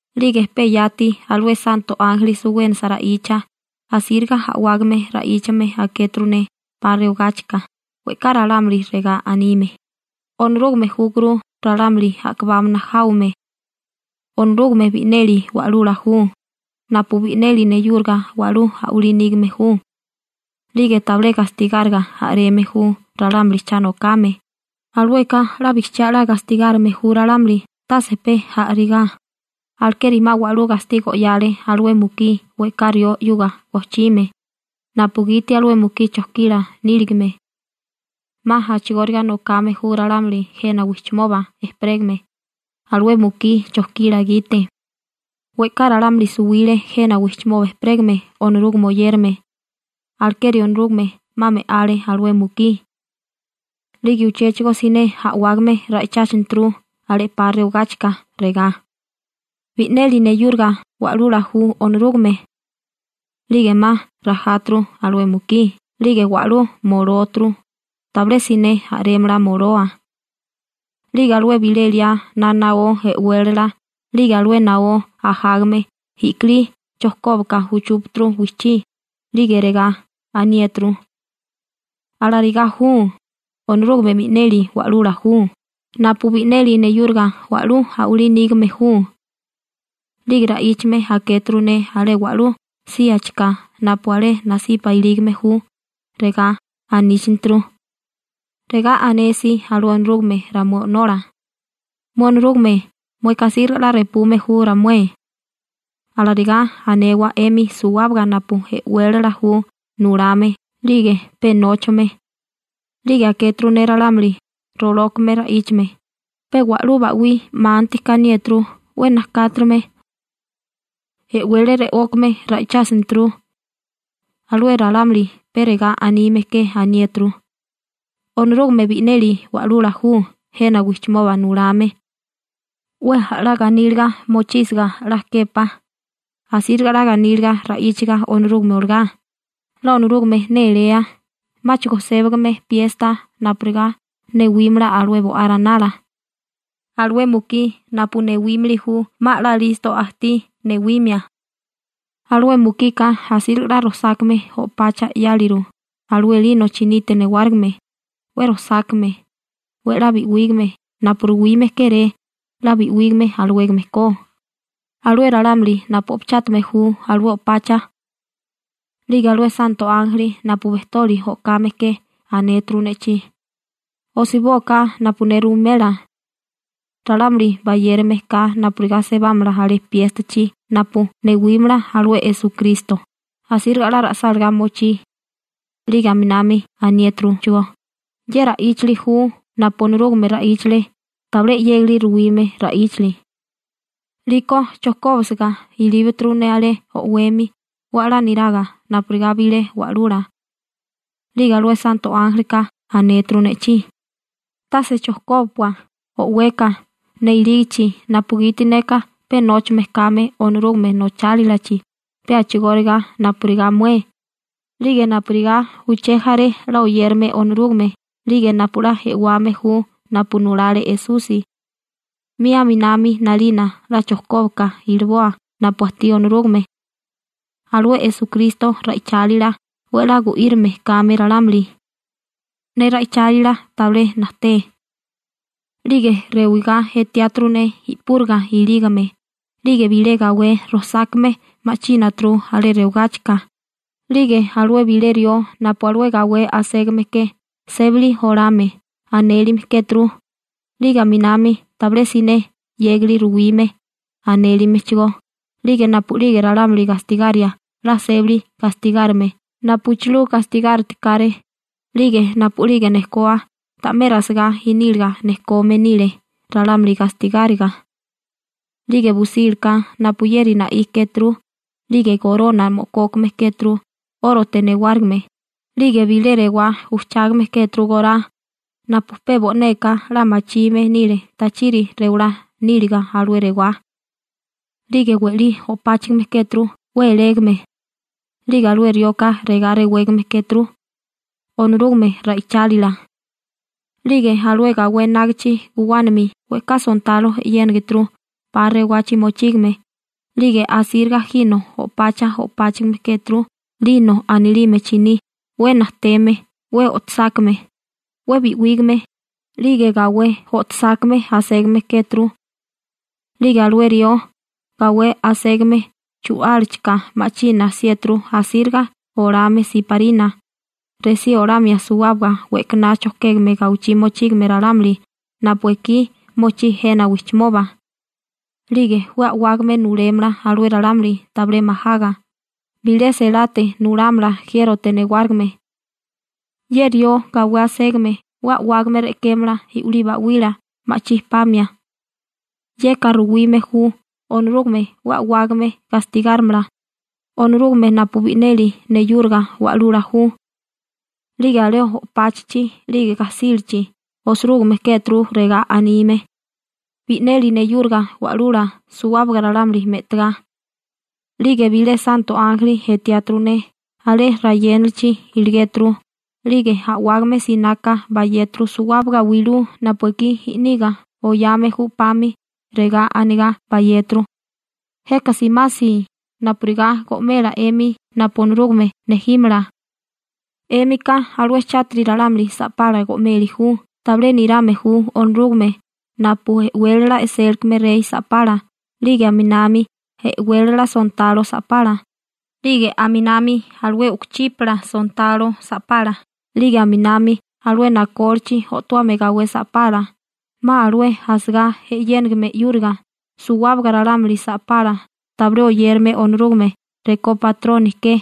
'Lige pe yati alué santo ánjeli suwénasa ra'icha, asíriga a'wágame ra'íchame akéturu ne 'pa rewagáchika, we'ká ralámuli regá anime: ¡Onorúgame júkuru ralámuli a'kabámana jáwame! Onorúgame bi'neli Wa'lula ju, napu bi'neli neyúriga wa'lú a'walí nígame ju, 'lige tabilé gastigáriga a'reme ju ralámuli cha nokame, alueka 'la bijchiá 'la gastigárime ju ralámuli tase pe a'rigá, alekeri 'ma wa'lú gastigo 'yale alué mukí we'ká rió 'yuga gojchime, napugiti alué mukí chojkila níligame. 'Ma a'chigóriga nokame ju ralámuli jena wijchimoba ejperégame. Alué mukí chojkila gite we'ká ralámuli suwile jena wijchimoba ejperégame Onorúgame oyérame, alekeri Onorúgame 'ma me'ale alué mukí. 'Lige uchéchigo siné a'wágame ra'icháchineturu alé 'pa rewagáchika, regá: ―¡Bi'neli neyúriga Wa'lula ju Onorúgame! 'Lige 'ma rajáturu alué mukí 'lige wa'lú molóturu, tabilé siné a'rémala moloa. 'Lige alué bilé liá na naó e'wélala 'lige alué naó ajágame i'kilí chojkóbaka uchúpaturu wijchí, 'lige regá aniéturu: ―¡Alarigá ju! ¡Onorúgame bi'neli Wa'lula ju, napu bi'neli neyúriga wa'lú a'walí nígame ju! 'Lige ra'íchame akéturu ne alé wa'lú síachika napu alé nasipa ilígame ju, regá aníchaneturu: Regá anesi alué Onorúgame ramué O'nola: «Mué Onorúgame, mueka asíriga 'la repume ju ramué.» Alarigá anewa 'emi suwábaga napu e'wélala ju nulame 'lige pe nóchame. 'Lige akéturu ne ralámuli rolókame ra'íchame, pe wa'lú ba'wí 'manti kaniéturu 'we najkáturume. E'wele re'ókame ra'ichásinituru. Alué ralámuli pe regá anime ke aniéturu: ¡Onorúgame bi'neli Wa'lula ju, jena wijchimoba nulame! 'We 'la ganíliga mochísiga 'la képá, asíriga 'la ganíliga ra'íchaga Onorúgame olagá, 'la Onorúgame néléa, 'máchigo sébigame piesta napurigá newímala alué Bo'á Ranala. Alué mukí napu newímili ju 'ma 'la listo ajtí newimia. Alué mukika asíriga 'la rojsákame o'pacha 'yáliru alué «lino» chinite newárigime, 'we rojsákame, 'we 'la bi'wígame napu ruwime kéré 'la bi'wígame alawégame ko alué ralámuli napu o'pachátame ju alué o'pacha. 'Lige alué santo ánjeli napu bejtoli o'kame ke anéturu ne'chí: ―Osibóaká napu ne ruwimela: «Ralámuli bayérigame ka napurigá sebámala alé piéstachi napu newímala alué Esukristo, asíriga 'la ra'sálagá mochí.» 'Lige aminami aniéturuchigó: ―Ye ra'íchali ju napu Onorúgame ra'íchale, tabilé 'yégali ruwime ra'íchali. 'Liko chojkóbisiga ilíbaturu ne alé o'wemi 'we 'la niraga napurigá bilé wa'lula. 'Lige alué santo ánjelika anéturu ne'chí: ―¡Tase chojkóbapua o'weka ne ilígichi napugiti neka pe nóchame kame Onorúgame nochálilachi pe a'chigóriga napurigá mué 'lige napurigá uché jaré 'la oyérame Onorúgame 'lige napu 'la e'wame ju napu nulale Esusi! 'Mi a'minami 'nalina 'la chojkóbaka iliboa napu ajtí Onorúgame. Alué Esukristo ra'ichálila 'we 'la gu'írime kame ralámuli. Ne ra'ichálila tabilé najté. 'Lige rewigá etiáturu ne i'púriga ilígame, 'lige bilé gawé rojsákame ma'chínaturu alé rewagáchika, 'lige alué bilé rió napu alué gawé aségame ke «Sébali Olame» anélime kéturu, 'lige aminami «Tabilé Siné 'Yégili Ruwime» anélimechigó 'lige napu'lige ralámuli gastigaria 'la sébali gastigárime napuchilú gastigáritikáré, 'lige napu'lige nejkoa ta'mé rasigá iníliga nejkome nile ralámuli gastigáriga. 'Lige busílaka napuyeri na'í kéturu, 'lige gorona mo'kókame kéturu 'órote newárigime, 'lige bilé rewá ujchágame kéturu gorá napu pe bo'neka 'la machime nile tachiri rewalá níliga alué rewá. 'Lige we'lí o'páchigime kéturu 'we elégame. 'Lige alué rioka regá rewégame kéturu: «Onorúgame Ra'ichálila». 'Lige alué gawé enágichi guwánami we'ká sontalo e'yénigituru 'pa rewagachi mochígame, 'lige asíriga jino o'pacha o'páchigime kéturu «lino» anilime chiní 'we najteme 'we o'tosákame, 'we bi'wígame, 'lige gawé o'tosákame aségame kéturu. 'Lige alué rió gawé aségame chu'álachika ma'china 'siéturu asíriga olame siparina, resí olamia suwábaga we'kaná chojkégame gawichí mochígame ralámuli napu ekí mochí jena wijchimoba. 'Lige 'we a'wágame nulémala alué ralámuli tabilé majaga, bilé selate nulámala jiérote newárigime. Ye rió gawé aségame 'we a'wágame re'kémala i'wilí ba'wila ma'chí pamia. Yeka ruwime ju Onorúgame 'we a'wágame gastigárimala, Onorúgame napu bi'neli neyúriga Wa'lula ju. 'Lige alé o'páchichi 'lige gajsílachi osirúgime kéturu regá anime: «Bi'neli neyúriga Wa'lula suwábaga ralámuli me'tagá.» 'Lige bilé santo ánjeli etiáturu ne, alé rayénalichi iligéturu, 'lige a'wágame sináká bayéturu suwábaga wilú napu ekí i'niga oyame ju 'pami, regá anigá bayéturu: ―Jeka simasi, napurigá go'mela 'emi napu Onorúgame nejímala. 'Émika alué chátiri ralámuli sa'pala go'meli ju tabilé nirame ju Onorúgame napu e'wélala e'sélikame rey sa'pala 'lige aminami e'wélala sontalo sa'pala, 'lige aminami alué u'kuchípala sontalo sa'pala, 'lige aminami alué nakólichi o'towame gawé sa'pala 'ma alué asagá e'yénigime 'yúriga, suwábaga ralámuli sa'pala tabilé oyérame Onorúgame rekó batroni ke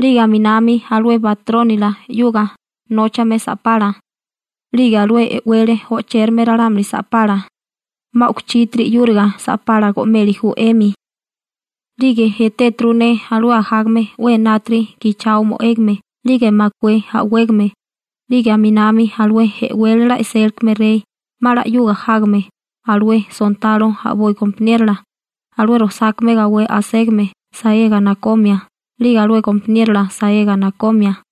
'lige aminami alué batrónila 'yuga nóchame sa'pala, 'lige alué e'wele o'chérame ralámuli sa'pala 'ma u'kuchítiri 'yúriga sa'pala go'meli ju 'emi. 'Lige etéturu ne alué ajágame 'we enátiri gichao mo'égame 'lige makué a'wégame, 'lige aminami alué e'wélala e'sélikame rey 'ma 'la 'yuga jágame alué sontalo a'boi gompaniérola alué rojsákame gawé aségame saega nakomia 'lige alué gompaniérola saega nakomia.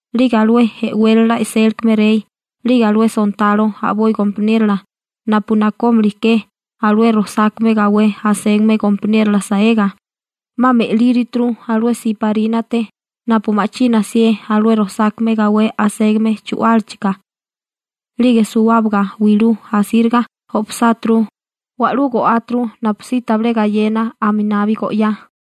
'Lige alué e'wélala e'sélikame rey 'lige alué sontalo a'boi gompaniérola napu nakómili ke alué rojsákame gawé aségame gompaniérola saega, 'ma me'líruturu alué siparínate napu ma'china 'sié alué rojsákame gawé aségame chu'álachika. 'Lige suwábaga wilú asíriga o'pasáturu, wa'lú go'áturu napusí tabilé gayena aminabi go'yá.